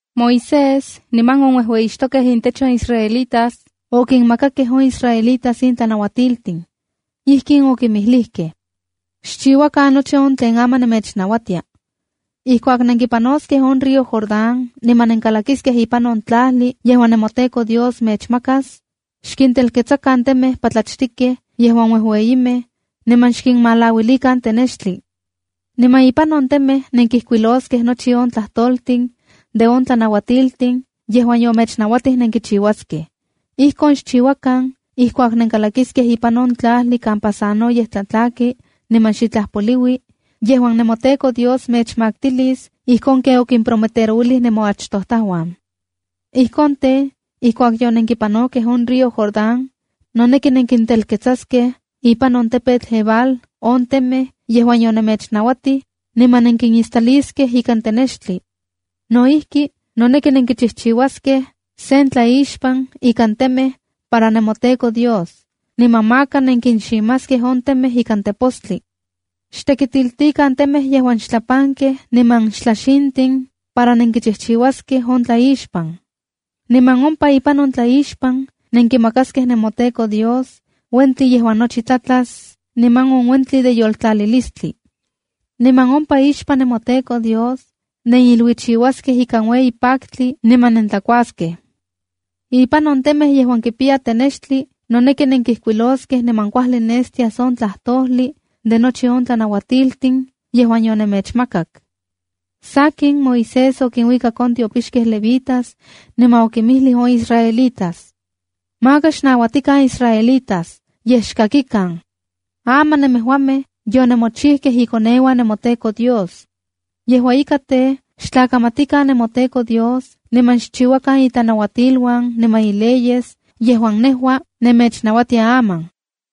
Moisés, niman on uejueyixtokej intech on israelitas okinmakakej on israelitas in tlanauatiltin. Ijkin okinmijlijkej: “Xchiuakan nochi on tlen aman nemechnauatia. Ijkuak nenkipanoskej on río Jordán niman nenkalakiskej ipan on tlajli yejuan nemoTEKO Dios mechmakas, xkintelketsakan temej patlachtikej yejuan uejueyimej, niman xkinmalauilikan tenextli. Niman ipan on temej nenkijkuiloskej nochi on tlajtoltin de on tlanauatiltin yejuan yomechnauatij nenkichiuaskej. Ijkon xchiuakan ijkuak nenkalakiskej ipan on tlajli kampa sanoyej tlatlaki niman xitlaj poliui yejuan nemoTEKO Dios mechmaktilis ijkon ken okimprometerouilij nemoachtojtajuan. Ijkon tej, ijkuak yonenkipanokej on río Jordán, noneki nenkintelketsaskej ipan on tepetl Ebal on temej yejuan yonemechnauatij, niman nenkinistaliskej ikan tenextli. No ijki, noneki nenkichijchiuaskej sen tlaixpan ikan temej para nemoTEKO Dios, niman maka nenkinximaskej on temej ikan tepostli. Xtekitiltikan temej yejuan xtlapankej niman xtlaxintin para nenkichijchiuaskej on tlaixpan. Niman ompa ipan on tlaixpan nenkimakaskej nemoTEKO Dios uentli yejuan nochi tlatlas, niman on uentli de yoltlalilistli. Niman ompa ixpan nemoTEKO Dios neniluichiuaskej ikan ueyi paktli niman nentlakuaskej. Ipan on temej yejuan kipiya tenextli noneki nenkijkuiloskej niman kuajli nestias on tlajtojli de nochi on tlanauatiltin yejuan yonemechmakak.” Sakin, Moisés okinuikak on tiopixkej levitas, niman okinmijlij on israelitas: “Maka xnauatikan israelitas, yej xkakikan. Aman nemejuamej yonemochijkej ikoneuan nemoTEKO Dios. Yejua ika, tej xtlakamatikan nemoTEKO Dios niman xchiuakan itlanauatiluan niman ileyes yejuan nejua nemechnauatia aman.”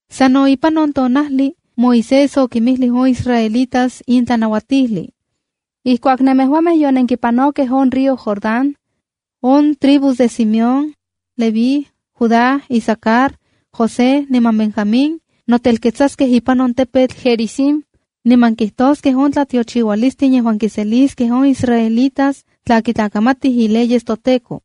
Sano ipan on tonajli Moisés okinmijlij on israelitas in tlanauatijli: “Ijkuak nemejuamej yonenkipanokej on río Jordán, on tribus de Simeón, Leví, Judá, Isacar, José niman Benjamín notelketsaskej ipan on tepetl Gerizim niman kitoskej on tlatiochiualistin yejuan kiseliskej on israelitas tla kitlakamatij ileyes toTEKO.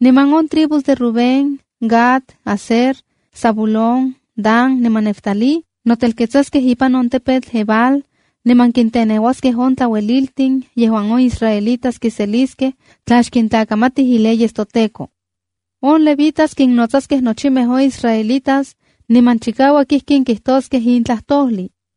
Niman on tribus de Rubén, Gad, Aser, Zabulón, Dan niman Neftalí notelketsaskej ipan on tepetl Ebal niman kinteneuaskej on tlaueliltin yejuan on israelitas kinseliskej tla xkintlakamatij ileyes toTEKO. On levitas kinnotsaskej nochimej on israelitas, niman chikauak ijkin kijtoskej in tlajtojli: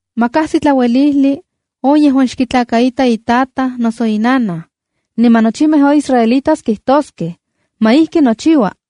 ’“Ma kajsi tlauelijli on yejuan xkitlakaita itataj noso inanaj. Niman nochimej on israelitas kijtoskej: “¡Ma ijki nochiua!”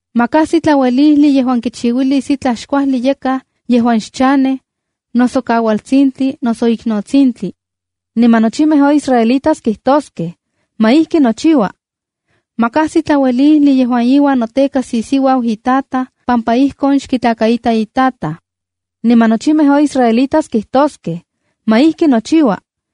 ’“Ma kajsi tlauelijli yejuan kichiuilis itlaj xkuajli yakaj yejuan xchanej, noso kaualtsintli noso iknotsintli.” Niman nochimej on israelitas kijtoskej: “¡Ma ijki nochiua!” ’“Ma kajsi tlauelijli yejuan iuan notekas isiuau itataj pampa ijkon xkitlakaita itataj.” Niman nochimej on israelitas kijtoskej: “¡Ma ijki nochiua!”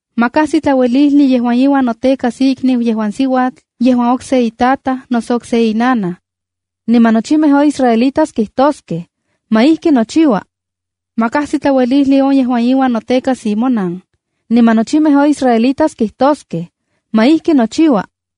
’“Ma kajsi tlauelijli yejuan iuan notekas ikniu yejuan siuatl yejuan okse itataj noso okse inanaj.” Niman nochimej on israelitas kijtoskej: “¡Ma ijki nochiua!” ’“Ma kajsi tlauelijli on yejuan iuan notekas imonan.” Niman nochimej on israelitas kijtoskej: “¡Ma ijki nochiua!”